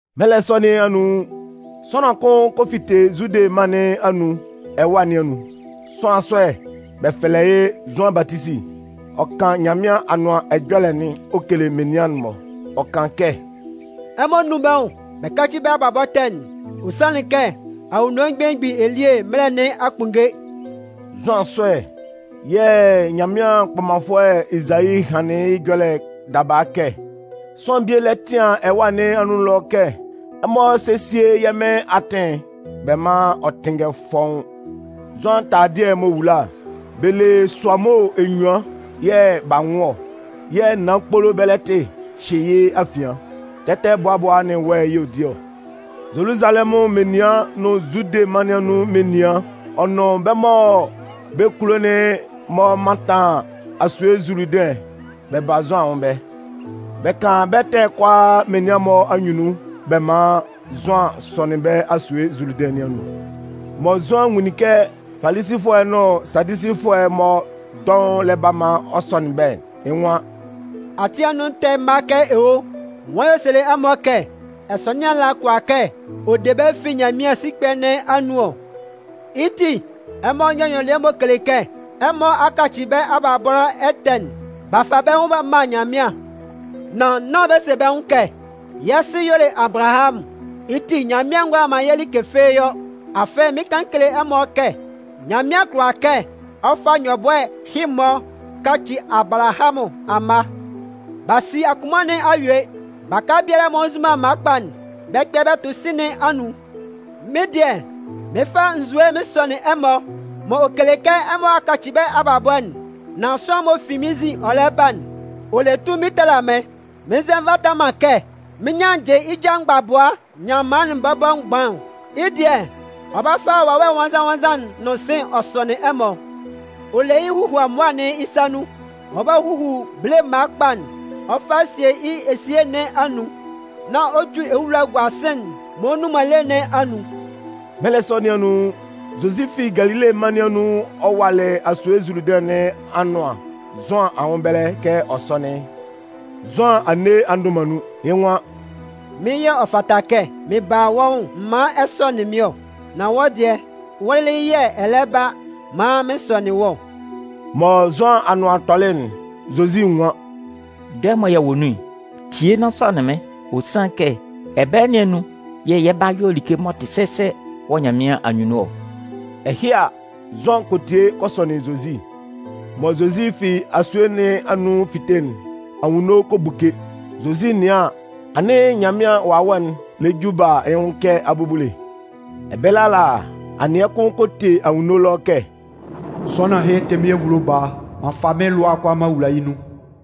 Mɛlɛ sɔ nɩn anun, sʋanlan kʋn kɔ fite Zude mân nɩn anun ɛwâ nɩn anun. Sʋanlan sɔ'n, bɛ fɛlɛ yɩ́ Zʋan Batisi. Ɔ kan Nyanmɩan Anʋan Ɛjɔlɛ'n ɔ kele menian'n-mɔ. Ɔ kan kɛ: “Ɛmɔ nún bɛ́ nwʋn bɛ yáci bɛ́ abalabɔ ɛtɛ'n. Ɔ sanlɩn kɛ Anwunno Belemgbin elie mɛlɛ nɩn a kpunnge.” Zʋan sɔ'n yɛ̂ Nyanmɩan kpɔmanfʋɛ Ezayi hanlɩn yɩ́ ɛjɔlɛ daba kɛ: Sʋanlan bie lɛ tɩan ɛwâ nɩn anun ɛlɔ kɛ: Ɛmɔ sésie yɛ́ Mɩn atɩn'n, bɛ mán ɔ tɩ́nngɛ fɔ́ʋ́n! Zʋan taladɩɛ'n m'ɔ wula'n, bɛ le sʋamo enyuan yɛ̂ b'a nwʋn ɔ, yɛ̂ naan kpolo bɛlɛtɩ hyɩ yɩ́ afian. Tɛtɛbʋabʋa nʋn wɛ yɛ̂ ɔ di ɔ. Zoluzalɛmʋn menian nʋn Zude mân nɩn anun menian, ɔ nʋn bɛ́ mɔ bɛ́ kulo'n-mɔ mantan asue Zuludɩn'n, bɛ ba Zʋan anwʋn ɛbɛlɛ. Bɛ kan bɛ́ ɛtɛ'n kʋalaa menian'n-mɔ anyunnun bɛ man Zʋan sɔnɩn bɛ́ asue Zuludɩn nɩn anun. Mɔ Zʋan nwunlin kɛ Falisifʋɛ nʋn Sadusifʋɛ'n-mɔ dɔʋn lɛ ba maan ɔ sɔnɩn bɛ́'n, yɩ́ nwan: “Ati anun ɛtɛ mma kɛ owo! Nwan yɛ̂ ɔ selɩ ɛmɔ kɛ ɛsɔnɩan nɩn ala kʋala kɛ ɔ de bɛ́ fi Nyanmɩan sikpɛ nɩn anwʋn ɔ? Yɩ́ ti, ɛmɔ yɔ́ nyɔlɩɛ m'ɔ kele kɛ ɛmɔ a kaci bɛ́ abalabɔ ɛtɛ'n b'a fa bɛ́ nwʋn b'a man Nyanmɩan. Nan nán bɛ se bɛ́ nwʋn kɛ: ‘Yɛ́ sɩ y'ɔ le Abalahamʋn, yɩ́ ti Nyanmɩan ngʋala man yɛ́ like fɩ́ɩ́ yɔ.’ Afɩ mɩɩn kan mɩn kele ɛmɔ kɛ Nyanmɩan kʋala kɛ ɔ fa nyɔbʋɛ ɛhɩ-mɔ kaci Abalahamʋn amma. B'a si akunman nɩn a yue. Baka biala m'ɔ nzu man mma kpa'n, bɛ 'kpɛ bɛ tʋ sɩ̂n nɩn anun. “Mɩ́n dɩɛ, mɩɩn fa nzue mɩn sɔnɩn ɛmɔ m'ɔ kele kɛ ɛmɔ a kaci bɛ́ abalabɔ'n. Nan sʋanlan'n m'ɔ fi mɩ́n nzin ɔ lɛ ba'n, ɔ le tunmin tala mɩ́n. Mɩn nzɛ nvata man kɛ mɩn nyannjɩ yɩ́ ja mgbabʋa nyanman'n bɔbɔ mgban ɔ. Yɩ́ dɩɛ, ɔ 'ba fa Wawɛ Nwannzan-nwannzan'n nʋn sɩ̂n ɔ sɔnɩn ɛmɔ. Ɔ le yɩ́ huhuamʋa'n yɩ́ sa nun, ɔ 'ba huhu bele mma kpa'n ɔ fa sie yɩ́ esie nɩn anun, nan ɔ ju ewula'n gua sɩ̂n'n m'ɔ nnun man lé nɩn anun.” Mɛlɛ sɔ nɩn anun, Zozi fi Galile mân nɩn anun ɔ walɩ asue Zuludɩn nɩn anʋan Zʋan anwʋn ɛbɛlɛ kɛ ɔ sɔ́nɩn yɩ́. Zʋan a nne a ndʋ man nun, yɩ́ nwan: “Mɩ́n yɛ̂ ɔ fata kɛ m ba wɔ́ nwʋn m man ɛ sɔnɩn mɩ́n ɔ. Nan wɔ́ dɩɛ, wɔ́ lɩlɩ yɛ̂ ɛ lɛ ba maan mɩn sɔnɩn wɔ́ ɔ!” Mɔ Zʋan anʋan tɔlɩ'n, Zozi nwan: “Dɔɛ mɔ yɛ wɔ nun'n, tie nán sɔnɩn mɩ́n. Ɔ sanlɩn kɛ, ɛbɛlɛ nɩn anun yɛ̂ yɛ 'ba yɔ like m'ɔ tɩ sɛsɛ wɔ Nyanmɩan anyunnun ɔ.” Ɛhɩ a, Zʋan kɔ tie ɔ kɔ sɔnɩn Zozi. Mɔ Zozi fi asue nɩn anun ɔ 'fite'n, anwunno kɔ buke. Zozi 'nɩan an, anɩn Nyanmɩan Wawɛ'n lɛ ju ɔ ba yɩ́ nwʋn kɛ abubule. Ɛbɛlɛ ala, anɩɛ kʋn kɔ te anwunno ɛlɔ kɛ: “Sʋanlan ɛhɩ tɩ mɩ́n ehulo Baa, m'an fa mɩ́n lʋa'n kʋalaa m'an wula yɩ́ nun.”